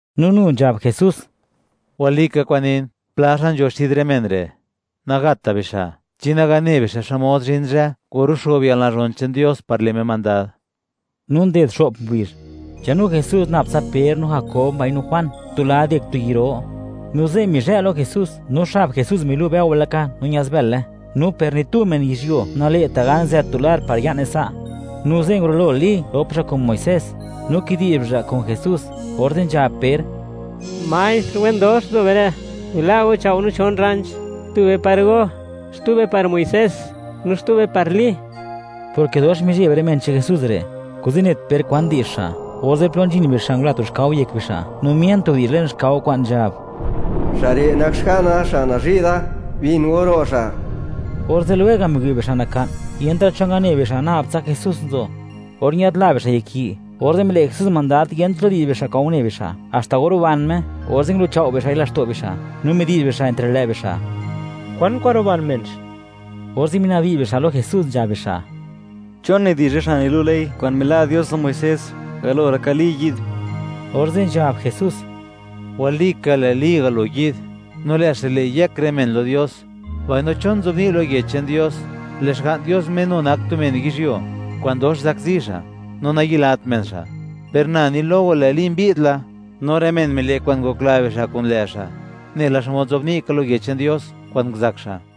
No nu nzhab Jesús: ―Walika kwa'n nin, pla xa' nzho xid rë men re', nagatta' bixa' chi naga ne bixa', xmod zhin zhë or luxo'b yalnazhon che'n Dios par le' Me mandad. No nded xo'p ngubizh, nzhanu Jesús nab tsa Per, no Jakob, mbaino Juan, tu lad yek tu yi' ro. No ze' mizhë' lo Jesús. No xab Jesús milu' bëo laka no ñaz bële; no per ni tu men yizhyuo nale'ta' gan zët tu lar par ya'ne sa'. No ze' ngurulo Li, rop xa' kun Muisés, no kidi'zh bixa' kun Jesús. Orze' nzhab Per: ―¡Maestr, wen dox nzo be re'! ¡Bila' go chao' no chon rranch; tube par go, xtube par Muisés, no xtube par Li! Porke dox mizheb rë men che'n Jesús re', kuze' net Per kwan di'zh xa'. Orze' plo nzhin bixa', ngula tu xkao yek bixa', no mien tu widi'zh le'n xkao kwa'n nzhab: ―¡Xa' re' nak Xga'na xa' nazhi' da! ¡Bin go ro' Xa'! Orze' lwega' miwi' bixa' naka'n, yentra' cho ngane bixa', nab tsa Jesús nzo. Or ñadla bixa' yek yi', orze' mile' Jesús mandad, yent plo di'zh bixa' kwa'n une bixa', haxta or ruban Me. Orze' ngulu'chao' bixa'i laxto' bixa', no midi'zh bixa' entre lë' bixa', ¿kwan kwa'n ruban menx? Orze' minabdi'zh bixa' lo Jesús, nzhab bixa': ―¿Chon nidi'zh rë xa' nilu' ley kwa'n mila' Dios lo Muisés, galo laka Li yi'd? Orze' nzhab Jesús: ―Walika, lë' Li galo yi'd, no lë' xa' le' yëk rë men lo Dios, mbaino, ¿chon nzobni' lo Yech che'n Dios, lë' Xga'n Dios Me nu nak tu men yizhyuo, kwa'n dox zakzi xa', no nayilat men xa'? Per na ni lo go, lë' Li mbi'd la, no rë men mile' kwa'n ngokla bixa' kun lë' xa', nela xmod nzobni' ka lo Yech che'n Dios, kwa'n nguzak xa'.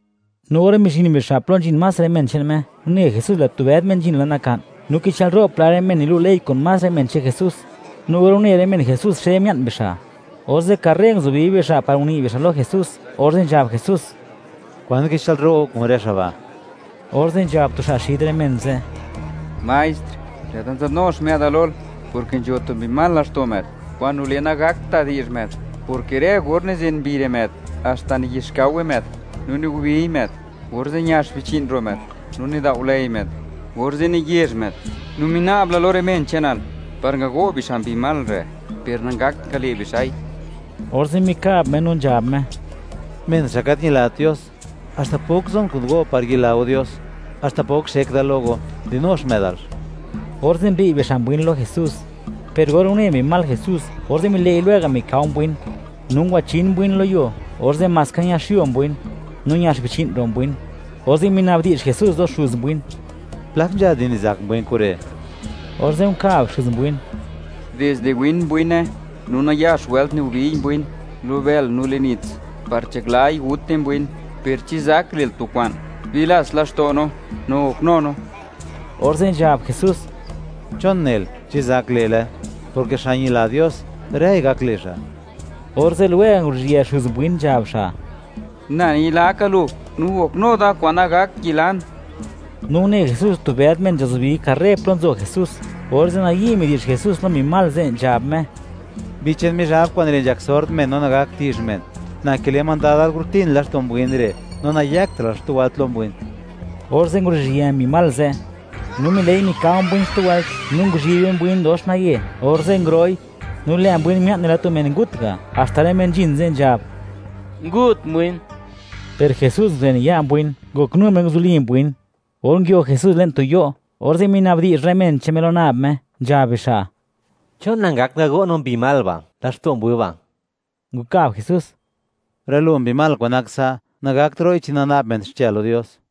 No or mizhin bixa' plo nzhin más rë men che'n Me, une Jesús lë' tu bëd men nzhin la naka'n, no kichë'lro' pla rë men nilu' ley kun más rë men che'n Jesús. No or une rë men Jesús, xe mia'n bixa', orze' karre nguzubi bixa' par uni' bixa' lo Jesús, orze' nzhab Jesús: ―¿Kwan kichë'lro' go kun rë xa' ba'? Orze' nzhab tu xa' xid rë men ze': ―Maestr, lë'da nzëdnu xmë'da lol, porke nzho tu mbi mal laxto' më'd, kwa'n nile' nagakta' di'zh më'd, porke rë or nizen mbi re' më'd, haxta niyixkaowe më'd no nigubiy më'd; orze' ñax bichi'n ro' më'd no nidao'lëi më'd, orze' niyezh më'd; no mina'bla da lo rë men che'nal par ngago' bixa' mbi mal re', per nangakta' ngale' bixa'i. Orze' mikab Me, no nzhab Me: ―¡Men xa' gat ñilat Dios! ¿Haxta pok zon kun go par yila go Dios? ¿Haxta pok xek da lo go? ¡Dinu xmë'dalx! Orze' mbi'y bixa' mbwin lo Jesús; per or une mbi mal Jesús, orze' mile'i lwega' mikao mbwin, no ngwachin mbwin lo yuo, orze' maska ñaxyo mbwin, no ñax bichi'n ro' mbwin. Orze' mina'bdi'zh Jesús lo xuz mbwin: ―¿Plak nzha di nizak mbwin kure'? Orze' nkab xuz mbwin: ―Dizde win mbwine. No nayax wëlt nigobiy mbwin lo bël no le'n nits, par nzhaklai gute mbwin; per chi zak le'l tu kwa'n, bilats laxto' go no, no goknu go no. Orze' nzhab Jesús: ―¿Chon nel: “Chi zak le'le”?, porke xa' ñila Dios, ¡rëi gak le' xa'! Orze' lwega' nguruzhië xuz mbwin, nzhab xa': ―¡Na ñilaka lu; no goknu da, kwa'n nagak yilan! No une Jesús, tu bëd men nzhazubi karre plo nzo Jesús, orze' nayi' midi'zh Jesús lo mbi mal ze', nzhab Me: ―¡Mbi che'n Mizhab kwa'n nile' nzhak sord men no nagakta' di'zh men, na kile' mandadal, gurutin laxto' mbwin re', no nayëktra'l xtu wëlt lo mbwin! Orze' nguru'zhië mbi mal ze', no mile'i mikao mbwin xtu wëlt, no nguzhibe mbwin dox naye, orze' nguro'i; no lë' mbwin mia'n nela tu men ngut ga', haxta rë men nzhin ze' nzhab: “Ngut mbwin.” Per Jesús nguzen ya' mbwin, ngoknu Me nguzuli mbwin. Or nguio Jesús le'n tu yo', orze' minabdi'zh rë men che'n Me lo nab Me, nzhab bixa': ―¿Chon nangakt ngago' no mbi mal ba', laxto' mbwin ba'? Nkab Jesús: ―Rë lo mbi mal kwa'n nak sa', nagakt ro'i chi nana'b men xche lo Dios.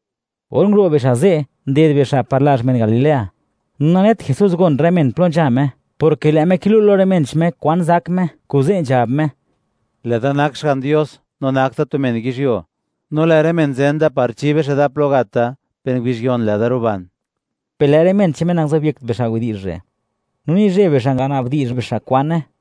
Or nguro' bixa' ze', nded bixa' par lazh men Galilea; no nanet Jesús, gon rë men plo nzha Me, porke lë' Me kilu' lo rë men che'n Me kwan zak Me, kuze' nzhab Me: ―Lë'da nak Xga'n Dios no nak da tu men yizhyuo; no lë' rë men zen da par chi bixa' da plo gat da; per ngubizh yon, lë'da ruban. Per lë' rë men che'n Me, nangazobyekt bixa' widi'zh re', no nizheb bixa' nganabdi'zh bixa' kwane.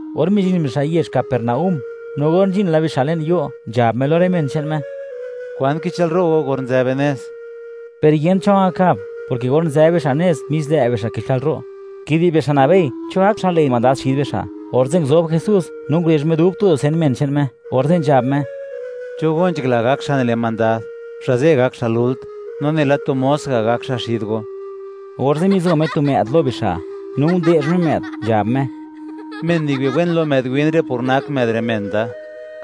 Or mizhin bixa' yezh Capernaúm, no or nzhin la bixa' le'n yo', nzhab Me lo rë men che'n Me: ―¿Kwan kichë'l ro' go, or nzë be nez? Per yent cho ngakab; porke or nzë bixa' nez, mis lë' bixa' kichë'l ro', kidi'zh bixa', nabei cho gak xa' le' mandad xid bixa'. Orze' nguzob Jesús, no ngurezh Me dub tu dusen men che'n Me, orze' nzhab Me: ―Cho go nzhakla, gak xa' nile' mandad; xa' ze' gak xa' lult, no nela tu mos ga' gak xa' xid go. Orze' mizo Me tu më'd lo bixa', no nde'zh Me më'd, nzhab Me: ―Men niwi' wen lo më'd win re' por nak më'd re' men da,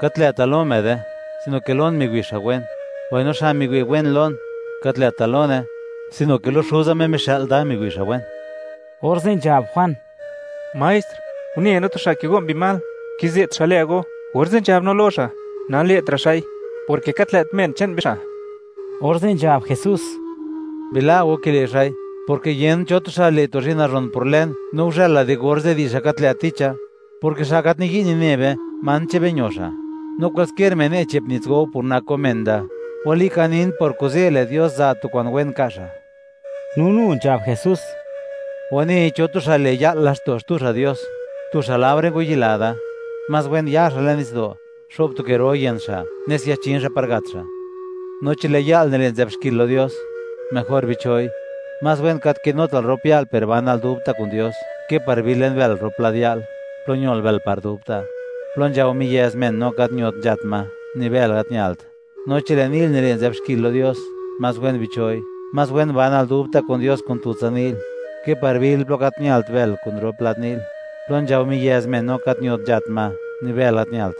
gat lë'ta' lo më'de, sino ke lon miwi' xa' wen; mbaino xa' miwi' wen lon, gat lë'ta' lone, sino ke lo Xuza Me mixë'l da, miwi' xa' wen. Orze' nzhab Juan: ―Maestr, une no tu xa' kigo' mbi mal, kize't xa' lë go. Orze' nzhab no lo xa', nale'tra' xa'i, porke gat lë't men che'n be xa'. Orze' nzhab Jesús: ―Bila' go kile' xa'i, porke yent cho tu xa' le' tu zhi'n nazhon por lën, no guzhëla di orze', di'zh xa' gat lë' ticha, porke xa' gat niyi' nine be, man che'n be ño xa'. No kwaliskier men ne' che'p nits go go, por nak go men da, walika nin, por kuze' lë' Dios za' tu kwa'n wen ka' xa'. No nu nzhab Jesús: ―Wanei cho tu xa' le', ya'l laxto' xtu xa' Dios, tu xa' laore ngwayila da; más wen ya xa' le'n nitsdo', xo'b tu ke ro yën xa', nes yachin xa' par gat xa'. No chi lë' ya'l nile' nizë'b xkil lo Dios; mejor bicho'i. Más wen gat kinutal rop ya'l, per banal dubta' kun Dios, ke par bil le'n bël, rop lad ya'l, plo ñol bël par dubta', plo nzhao miyëz men, no gat ñot nzhat ma; ni bël gat ñalt. No chi lë' ni'l nile' nizë'b xkil lo Dios, más wen bicho'i. Más wen banal dubta' kun Dios kun tutsa ni'l, ke par bil plo gat ñalt bël, kun rop lad ni'l, plo nzhao miyëz men, no gat ñot nzhat ma; ni bël gat ñalt.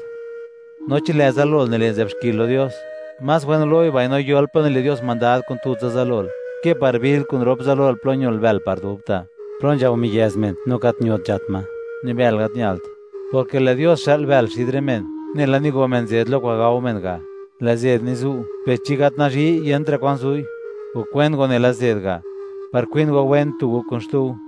No chi lë' zalol nile' nizë'b xkil lo Dios; más wen gulo'i, mbaino yol plo nile' Dios mandad kun tutsa zalol, ke par bil kun rop zalol plo ñol bël par dubta', plo nzhao miyëz men, no gat ñot nzhat ma; ni bël gat ñalt, porke lë' Dios xë'l bël xid rë men, nela nigo men zed lo kwa'n gao men ga'. Lë' zed nizu'; per chi gat nazhi'y, yentra' kwan zu'i. Gok wen go nela zed ga', par kwin go wen, tu go kun xtu go.